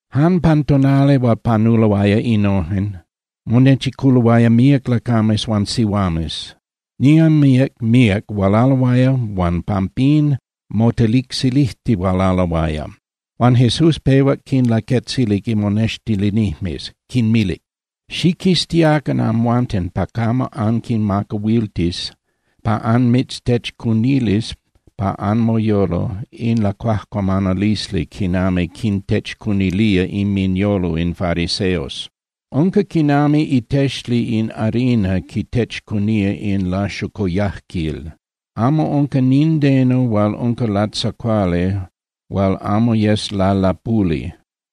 Jan pan tonali hual panuloaya innojen, monechiculoaya míac lacames huan sihuames, niman míac míac hualaloaya huan pampín motelicsilijtihualaloaya. Huan Jesús pehuac quinlaquetzilic imonextilinijmes, quinmilic: —Xiquiztiacan amhuanten pa camo anquimacahuiltis pa anmitztechcunilis pa anmoyolo in lacuajcuamanalisli quinami quintechcunilía inminyolo in fariseos. Unca quinami itexli in harina quitechcunía in laxocoyajquil. Amo unca nindeno hual unca latzacuali hual amo yes lalapuli.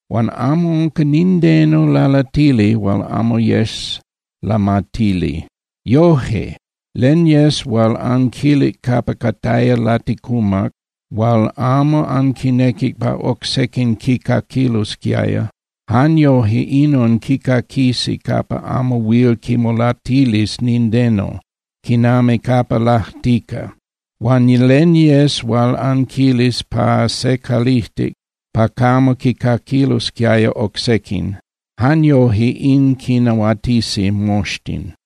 Huan amo unca nindeno lalatili hual amo yes lamatili. Yoje, len yes hual anquilic capa cataya laticumac hual amo anquinequic pa oc sequin quicaquilosquiaya, jan yoje inon quicaquisi capa amo huil quimolatilis nindeno, quinami capa lajtica. Huan len yes hual anquilis pa se calijtic pa camo quicaquilosquiaya oc sequin, jan yoje in quinahuatisi moxtin.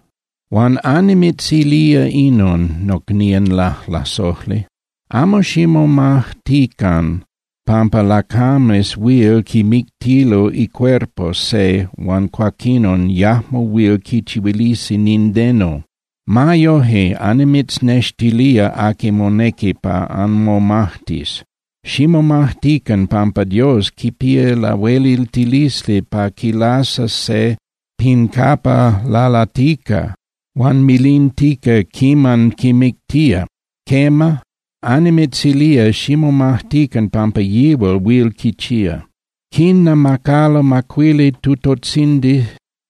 ’Huan annimitzilía inon, nocnían lajlasojli. Amo ximomajtican pampa lachames huil quimictilo icuerpo se huan cuaquinon yajmo huil quichihuilisi nindeno. Ma yoje, annimitznextilía aqui monequi pa anmomajtis. Ximomajtican pampa Dios quipía lahueliltilisli pa quilasas se pin capa lalatica huan milintica quiman quimictía. Quema, annimitzilía, ximomajtican pampa yihual huil quichía. ’Quinnamacalo macuili tutotzindis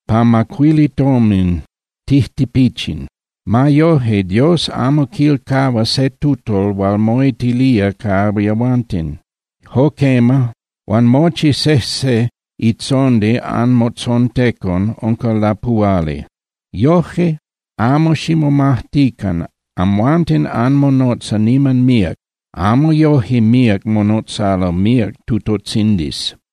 pa macuili tomin tijtipichin. Ma yoje, Dios amo quilcahua se tutol hual moitilía ca yehuanten. Jo quema, huan mochi sejse itzondi anmotzontecon unca lapuhuali. Yoje, amo ximomajtican. Amhuanten anmonotza niman míac, amo yoje míac monotzalo míac tutotzindis.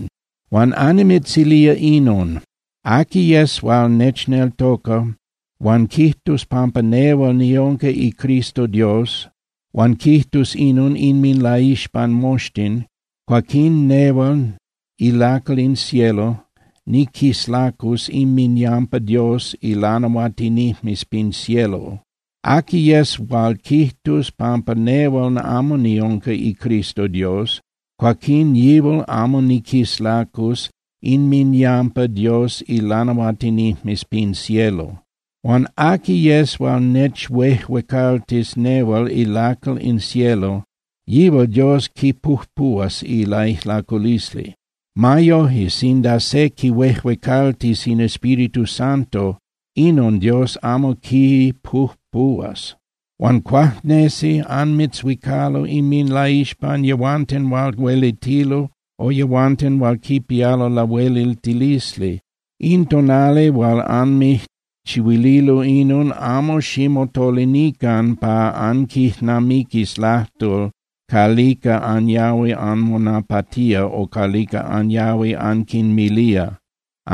’Huan annimitzilía inon. Aqui yes hual nechneltoca huan quijtus pampa nehual niunca iCristo Dios, huan quijtus inon inminlaixpan moxtin, cuaquín nehual ilacal in cielo niquislacus inminyampa Dios ilanahuatinijmes pin cielo. Aqui yes hual quijtus pampa nehual amo niunca iCristo Dios, cuaquín yihual amo niquislacus inminyampa Dios ilanahuatinijmes pin cielo. ’Huan aqui yes hual nechuejuecaltis nehual ilacal in cielo, yihual Dios quipujpuhuas ilaijlaculisli. Ma yoje, sinda se quihuejuecaltis in Espíritu Santo, inon Dios amo quipujpuhuas. ’Huan cuajnesi anmitzhuicalo inminlaixpan yehuanten hual huelitilo o yehuanten hual quipialo lahueliltilisli. In tonali hual anmijchihuililo inon, amo ximotolinican pa anquijnamiquis lajtol calica anyahui anmonapatía o calica anyahui anquinmilía.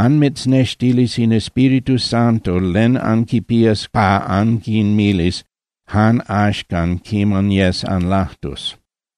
Anmitznextilis in Espíritu Santo len anquipías pa anquinmilis jan axcan quiman yes anlajtus.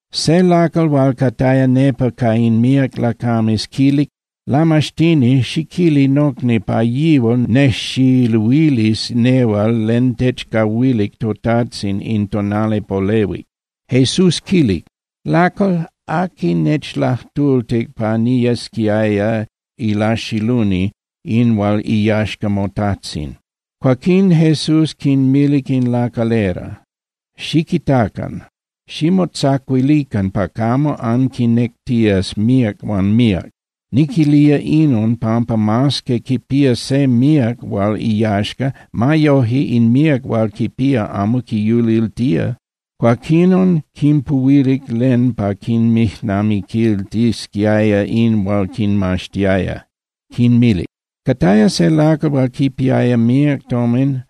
Se lacal hual cataya nepa ca in míac lacames quilic: —Lamaxtini, xiquili nocni pa yihual nejxiluilis nehual len techcahuilic totajtzin in tonali polehuic. Jesús quilic: —Lacal, ¿aqui nechlajtultic pa niyesquiaya ilaxiluni in hual iyaxca motajtzin? Cuaquín Jesús quinmilic in lacalera: —Xiquitacan. Ximotzacuilican pa camo anquinectías míac huan míac. Niquilía inon pampa mas que quipía se míac hual iyaxca, ma yoje in míac hual quipía amo quiyuliltía. Cuaquinon quinpuhuilic len pa quinmijnamiquiltisquiaya in hual quinmaxtiaya. Quinmilic: —Cataya se lacal hual quipiaya míac tomin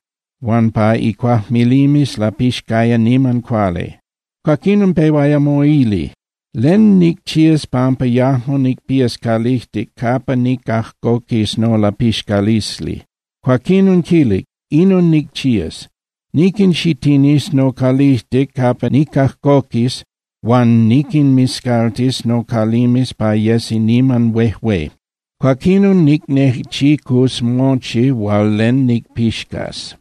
huan pa icuajmilimes lapixcaya niman cuali. Cuaquinon pehuaya moili: “¿Len nicchías pampa yajmo nicpías calijtic capa nicajcoquis nolapixcalisli?” Cuaquinon quilic: “Inon nicchías. Niquinxitinis nocalijtic capa nicajcoquis huan niquinmiscaltis nocalimes pa yesi niman huejué. Cuaquinon nicnechicus mochi hual len nicpixcas,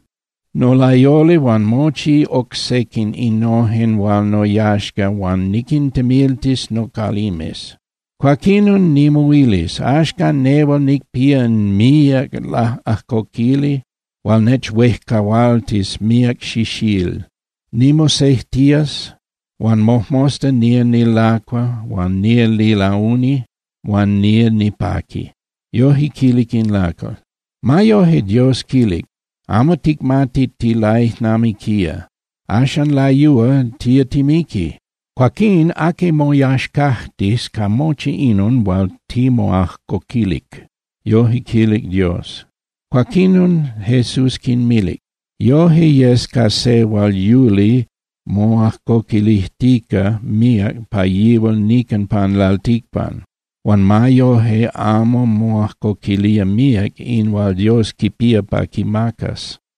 nolayoli huan mochi oc sequin innojen hual noyaxca huan niquintemiltis nocalimes. Cuaquinon nimoilis: Axcan nehual nicpía míac laꞌajcoquili hual nechuejcahualtis míac xixíl. Nimosejtías, huan mojmosta nía nilacua huan nía nilauni huan nía nipaqui.” Yoje quilic in lacal. Ma yoje, Dios quilic: “¡Amo ticmati tilaijnamiquía! Axan layúa tía timiqui. Cuaquín ¿aqui moyaxcajtis ca mochi inon hual timoajcoquilic?” Yoje quilic Dios. Cuaquinon, Jesús quinmilic: —Yoje yes ca se hual yuli moajcoquilijtica míac pa yihual nican pan lalticpan huan ma yoje amo moajcoquilía míac in hual Dios quipía pa quimacas.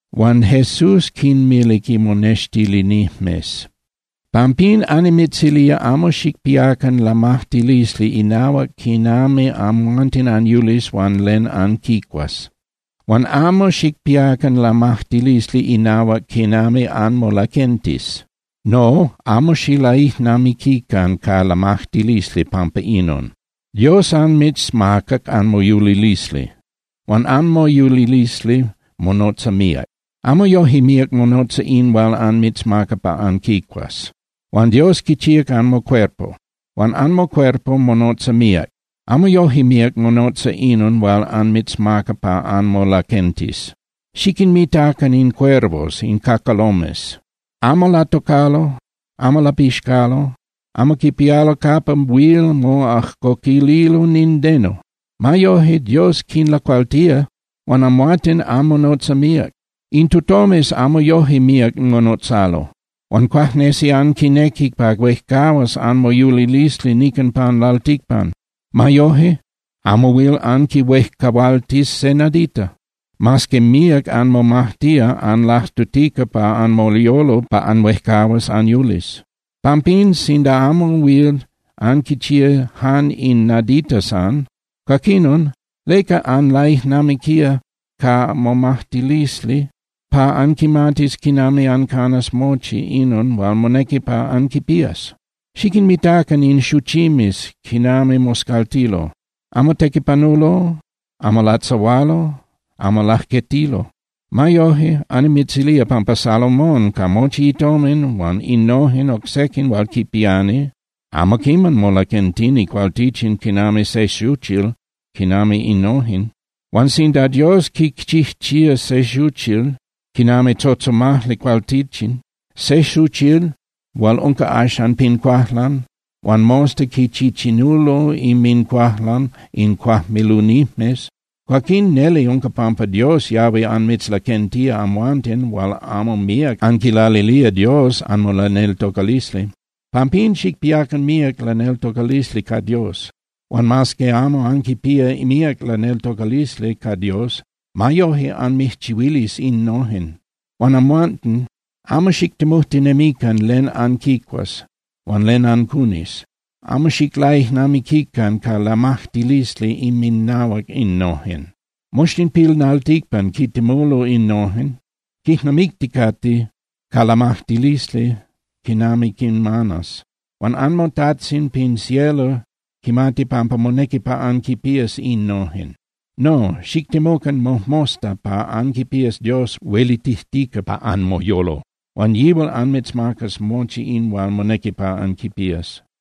Huan Jesús quinmilic imonextilinijmes: —Pampín annimitzilía amo xicpiacan lamajtilisli inahuac quinami amhuanten anyulis huan len anquicuas. Huan amo xicpiacan lamajtilisli inahuac quinami anmolaquentis. No, amo xilaijnamiquican ca lamajtilisli pampa inon. Dios anmitzmacac anmoyulilisli, huan anmoyulilisli monotza míac. Amo yoje míac monotza in hual anmitzmaca pa anquicuas. Huan Dios quichíac anmocuerpo, huan anmocuerpo monotza míac, amo yoje míac monotza inon hual anmitzmaca pa anmolaquentis. Xiquinmitacan in cuervos (cacalomes). Amo latocalo, amo lapixcalo, amo quipialo capa huil moajcoquililo nindeno. Ma yoje, Dios quinlacualtía. Huan amhuanten anmonotza míac. In tutomes amo yoje míac monotzalo. Huan cuajnesi anquinequi pa huejcahuas anmoyulilisli nican pan lalticpan. Ma yoje amo huil anquihuejcahualtis se nadita, mas que míac anmomajtía anlajtutica pa anmoyolo pa anhuejcahuas anyulis. Pampín, sinda amo huil anquichía jan in nadita san, cuaquinon ¿leca anlaijnamiquía ca momajtilisli pa anquimatis quinami ancanas mochi inon hual monequi pa anquipías? Xiquinmitacan in xuchimes quinami moscaltilo. Amo tequipanulo, amo latzahualo, amo lajquetilo. Ma yoje, annimitzilía pampa Salomón ca mochi itomin huan innojen oc sequin hual quipiani amo quiman molaquentini cualtichin quinami se xuchil quinami innojen. Huan sinda Dios quichijchía se xuchil quinami tzotzomajli cualtichin, se xuchil hual unca axan pin cuajlan huan mosta quichichinulo inmincuajlan in cuajmilunijmes, cuaquín neli unca pampa Dios yahui anmitzlaquentía amhuanten hual amo míac anquilalilía Dios anmolaneltocalisli. Pampín, xicpiacan míac laneltocalisli ca Dios. Huan mas que amo anquipía míac laneltocalisli ca Dios, ma yoje anmijchihuilis innojen. Huan amhuanten, amo xictemujtinemican len anquicuas huan len ancunis, amo xiclaijnamiquican ca lamajtilisli inminahuac innojen. Moxtin pin lalticpan quintemulo innojen, quijnamicticate ca lamajtilisli quinami quinmanas. Huan anmoTajtzin pin cielo quimati pampa monequi pa anquipías innojen. No, xictemucan mojmosta pa anquipías Dios huelitijtica pa anmoyolo, huan yihual anmitzmacas mochi in hual monequi pa anquipías.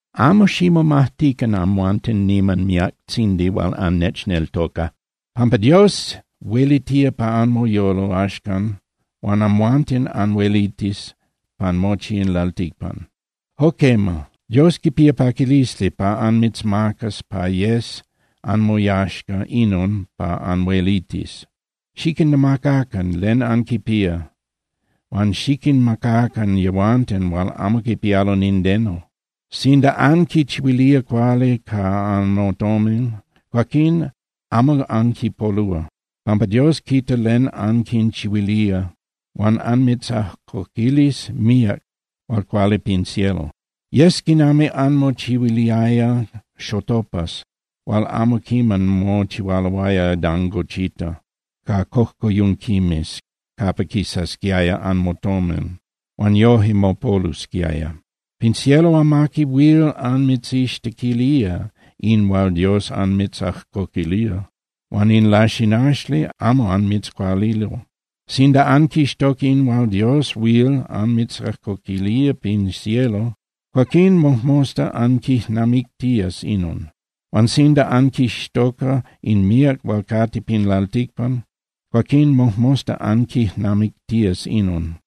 ’Amo ximomajtican, amhuanten niman miactzindi hual annechneltoca, pampa Dios huelitía pa anmoyolo axcan huan amhuanten anhuelitis pan mochi in lalticpan. Jo quema, Dios quipía paquilisli pa anmitzmacas pa yes anmoyaxca inon pa anhuelitis. Xiquinnamacacan len anquipía huan xiquinmacacan yehuanten hual amo quipialo nindeno. Sinda anquinchihuilía cuali ca anmotomin, cuaquín amo anquipolúa, pampa Dios quita len anquinchihuilía huan anmitzajcoquilis míac hual cuali pin cielo. Yes quinami anmochihuiliaya xotopas hual amo quiman mochihualoaya dangochita ca cojcoyunquimes capa quisasquiaya anmotomin huan yoje mopolusquiaya. Pin cielo amaqui huil anmitzixtequilía in hual Dios anmitzajcoquilía, huan in laxinaxli amo anmitzcualilo. Sinda anquixtoca in hual Dios huil anmitzajcoquilía pin cielo, cuaquín mojmosta anquijnamictías inon. Huan sinda anquixtoca in míac hual cate pin lalticpan, cuaquín mojmosta anquijnamictías inon.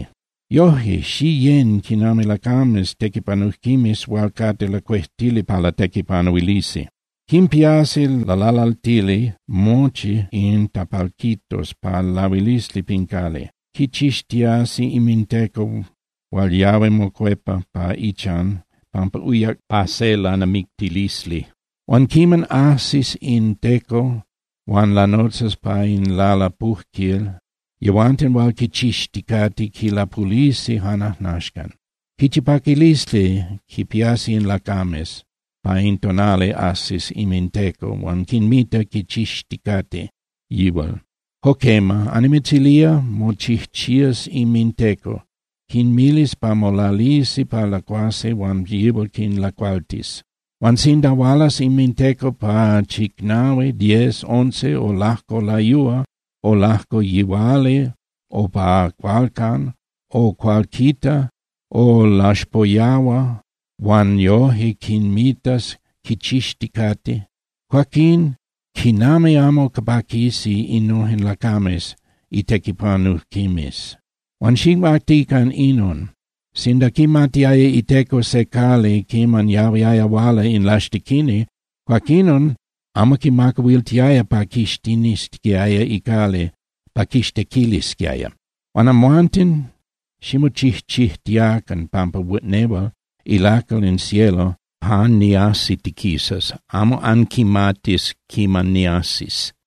’Yoje, xiyén quinami lacames tequipanujquimes hual cate lacuejtili pa latequipanuilisi. Quimpiasi lalalaltili mochi in tapalquitos pa lahuilisli pin cali. Quichixtiasi inminteco hual yahui mocuepa pa ichan pampa uyac pa se lanamictilisli. Huan quiman ajsis in teco huan lanotzas pa in lalapujquil, yehuanten hual quichixticate quilapulisi jan ajnaxcan. Quichi paquilisli quipiasi in lacames pa in tonali ajsis inminteco huan quinmita quichixticate yihual. Jo quema, annimitzilía, mochijchías inminteco, quinmilis pa molalisi pa lacuasi huan yihual quinlacualtis. Huan sinda hualas inminteco pa chicnahui, diez, once, o lajco layúa o lajco yihuali o pa cualcan o cualquita o laxpoyahua huan yoje quinmitas quichixticate, cuaquin ¡quinami amo paquisi innojen lacames itequipanujquimes! Huan xicmatican inon. Sinda quimatiaya iteco se cali quiman yahuiaya huala in laxtequini, cuaquinon amo quimacahuiltiaya pa quixitinisquiaya icali pa quixtequilisquiaya. Huan amhuanten ximochijchijtiacan pampa nehual ilacal in cielo jan niajsitiquisas, amo anquimatis quiman niajsis.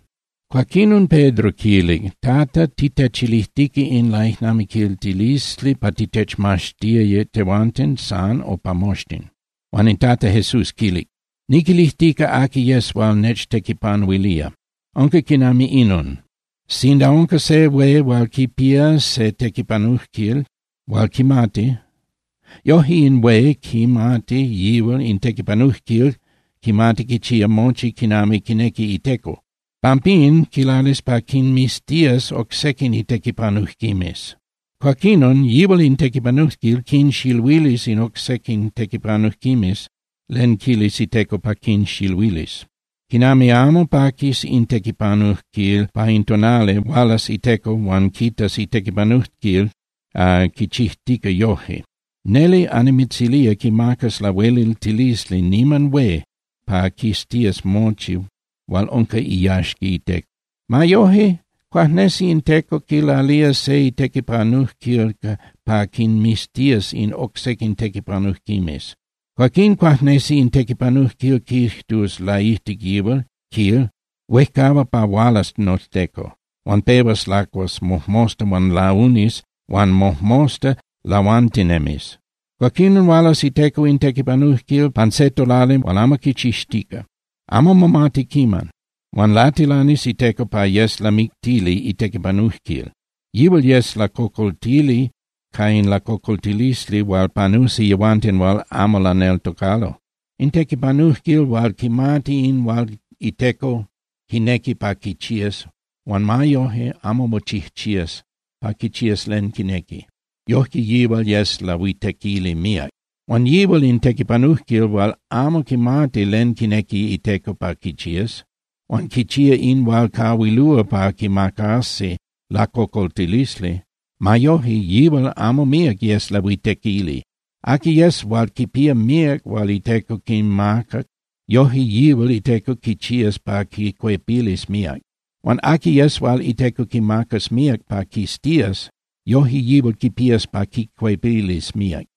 Cuaquinon Pedro quilic: —Tata, ¿titechilijtica in laijnamiquiltilisli pa titechmaxtis tehuanten san o pa moxtin? Huan in Tata Jesús quilic: —Niquilijtica aqui yes hual nechtequipanuilía. Unca quinami inon: Sinda unca se hué hual quipía se tequipanujquil hual quimati, yoje in hué quimati yihual in tequipanujquil quimati quichía mochi quinami quinequi iteco. Pampín quilalis pa quinmiztías oc sequin itequipanujquimes. Cuaquinon yihual in tequipanujquil quinxiluilis in oc sequin tequipanujquimes len quilis iteco pa quinxiluilis. ¡Quinami amo paquis in tequipanujquil pa in tonali hual hualas iteco huan quitas itequipanujquil quichijtica yoje! Neli annimitzilía, quimacas lahueliltilisli niman hué pa quiztías mochi hual unca iyaxca iteco. Ma yoje, cuajnesi in teco quilalía se itequipanujquil pa quinmiztias in oc sequin tequipanujquimes. Cuaquín cuajnesi in tequipanujquil quijtus laijtic yihual, quil: “Huejcahua pa hualas noteco”, huan pehuas lacuas mojmosta huan launis huan mojmosta lahuantinemis. Cuaquinon hualas iteco in tequipanujquil pan se tonali hual amo quichixtica, amo momati quiman. Huan latilanis iteco pa yes lamictili itequipanujquil. Yihual yes lacocoltili ca in lacocoltilisli hual panusi yehuanten hual amo laneltocalo. In tequipanujquil hual quimati in hual iteco quinequi pa quichías huan ma yoje amo mochijchías pa quichías len quinequi, yojque yihual yes lahuitequili míac. Huan yihual in tequipanujquil hual amo quimati len quinequi iteco pa quichías, huan quichía in hual cahuilúa pa quimacasi lacocoltilisli, ma yoje, yihual amo míac yes lahuitequili. Aqui yes hual quipía míac hual iteco quimacac, yoje yihual iteco quichías pa quicuepilis míac. Huan aqui yes hual iteco quimacas míac pa quiztías, yoje yihual quipías pa quicuepilis míac.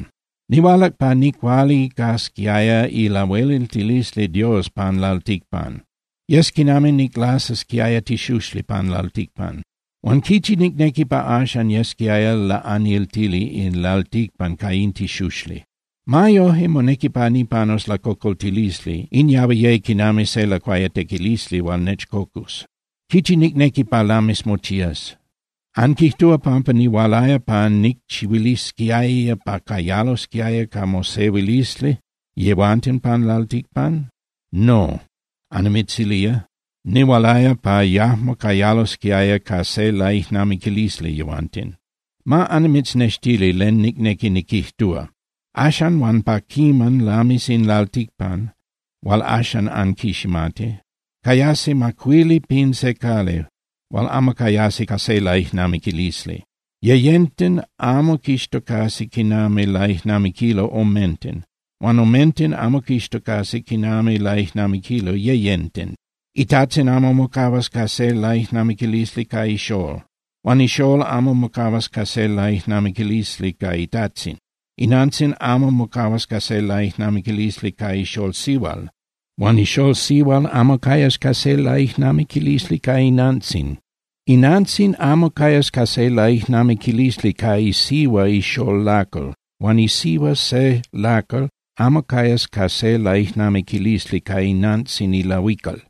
’Nihualac pa nicualicasquiaya ilahueliltilisli Dios pan lalticpan, yes quinami niclasasquiaya tixuxli pan lalticpan. Huan ¡quichi nicnequi pa axan yesquiaya laꞌaniltili in lalticpan ca in tixuxli! Ma yoje, monequi pa nipanus lacocoltilisli, in yahui ye quinami se lacuayatequilisli hual nechcocus. ¡Quichi nicnequi pa lamis mochías! ¿Anquijtúa pampa nihualaya pa nicchihuilisquiaya pa cayalosquiaya ca mosehuilisli yehuanten pan lalticpan? No, annimitzilía, nihualaya pa yajmo cayalosquiaya ca se laijnamiquilisli yehuanten. Ma annimitznextili len nicnequi niquijtúa: Axan huan pa quiman lamis in lalticpan hual axan anquiximati, cayasi macuili pin se cali hual amo cayasi ca se laijnamiquilisli. Yeyenten amo quixtocasi quinami laijnamiquilo omenten, huan omenten amo quixtocasi quinami laijnamiquilo yeyenten. Itajtzin amo mocahuas ca se laijnamiquilisli ca ixól, huan ixól amo mocahuas ca se laijnamiquilisli ca itajtzin. Inantzin amo mocahuas ca se laijnamiquilisli ca ixól sihual huan ixól sihual amo cayas ca se laijnamiquilisli ca inantzin. Inantzin amo cayas ca se laijnamiquilisli ca isihua ixól lacal huan isihua se lacal amo cayas ca se laijnamiquilisli ca inantzin ilahuical.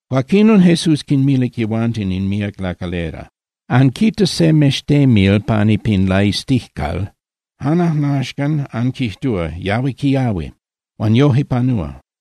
Cuaquinon Jesús quinmilic yehuanten in míac lacalera: —Anquita se mextemil pani pin laiztijcal, jan ajnaxcan anquijtúa: “Yahui quiahui”, huan yoje panúa.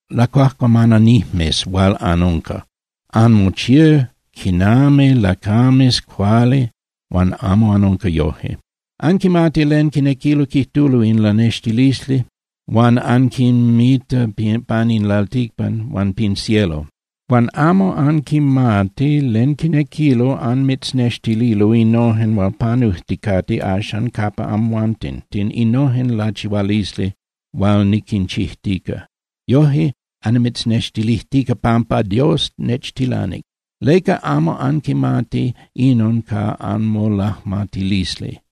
¡Lacuajcuamananijmes hual anunca! Anmochía quinami lacames cuali huan amo anunca yoje. Anquimati len quinequilo quijtulo in lanextilisli hual anquinmita pan in lalticpan huan pin cielo. Huan amo anquimati len quinequilo anmitznextilo innojen hual panujticate axan capa amhuanten, innojen lachihualisli hual niquinchijtica. Yoje annimitznextilijtica pampa Dios nechtilanic. ¿Leca amo anquimati inon ca anmolajmatilisli?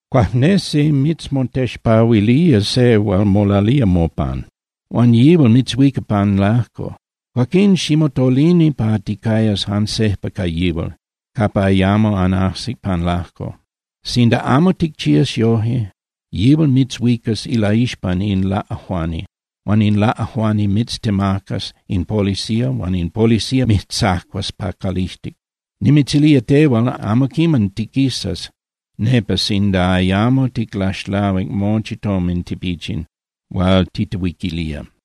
’Cuajnesi mitzmotexpahuilía se hual molalía mopan, huan yihual mitzhuica pan lajco. Cuaquín ximotolini pa ticayas jan sejpa ca yihual capa ayamo anajsis pan lajco. Sinda amo ticchías yoje, yihual mitzhuicas ilaixpan in laꞌajuani huan in laꞌajuani mitztemacas in policía huan in policía mijtzacuas pa calijtic. Nimitzilía tehual, amo quiman tiquisas nepa sinda ayamo ticlaxlahuic mochi tomin tipichin hual titehuiquilía.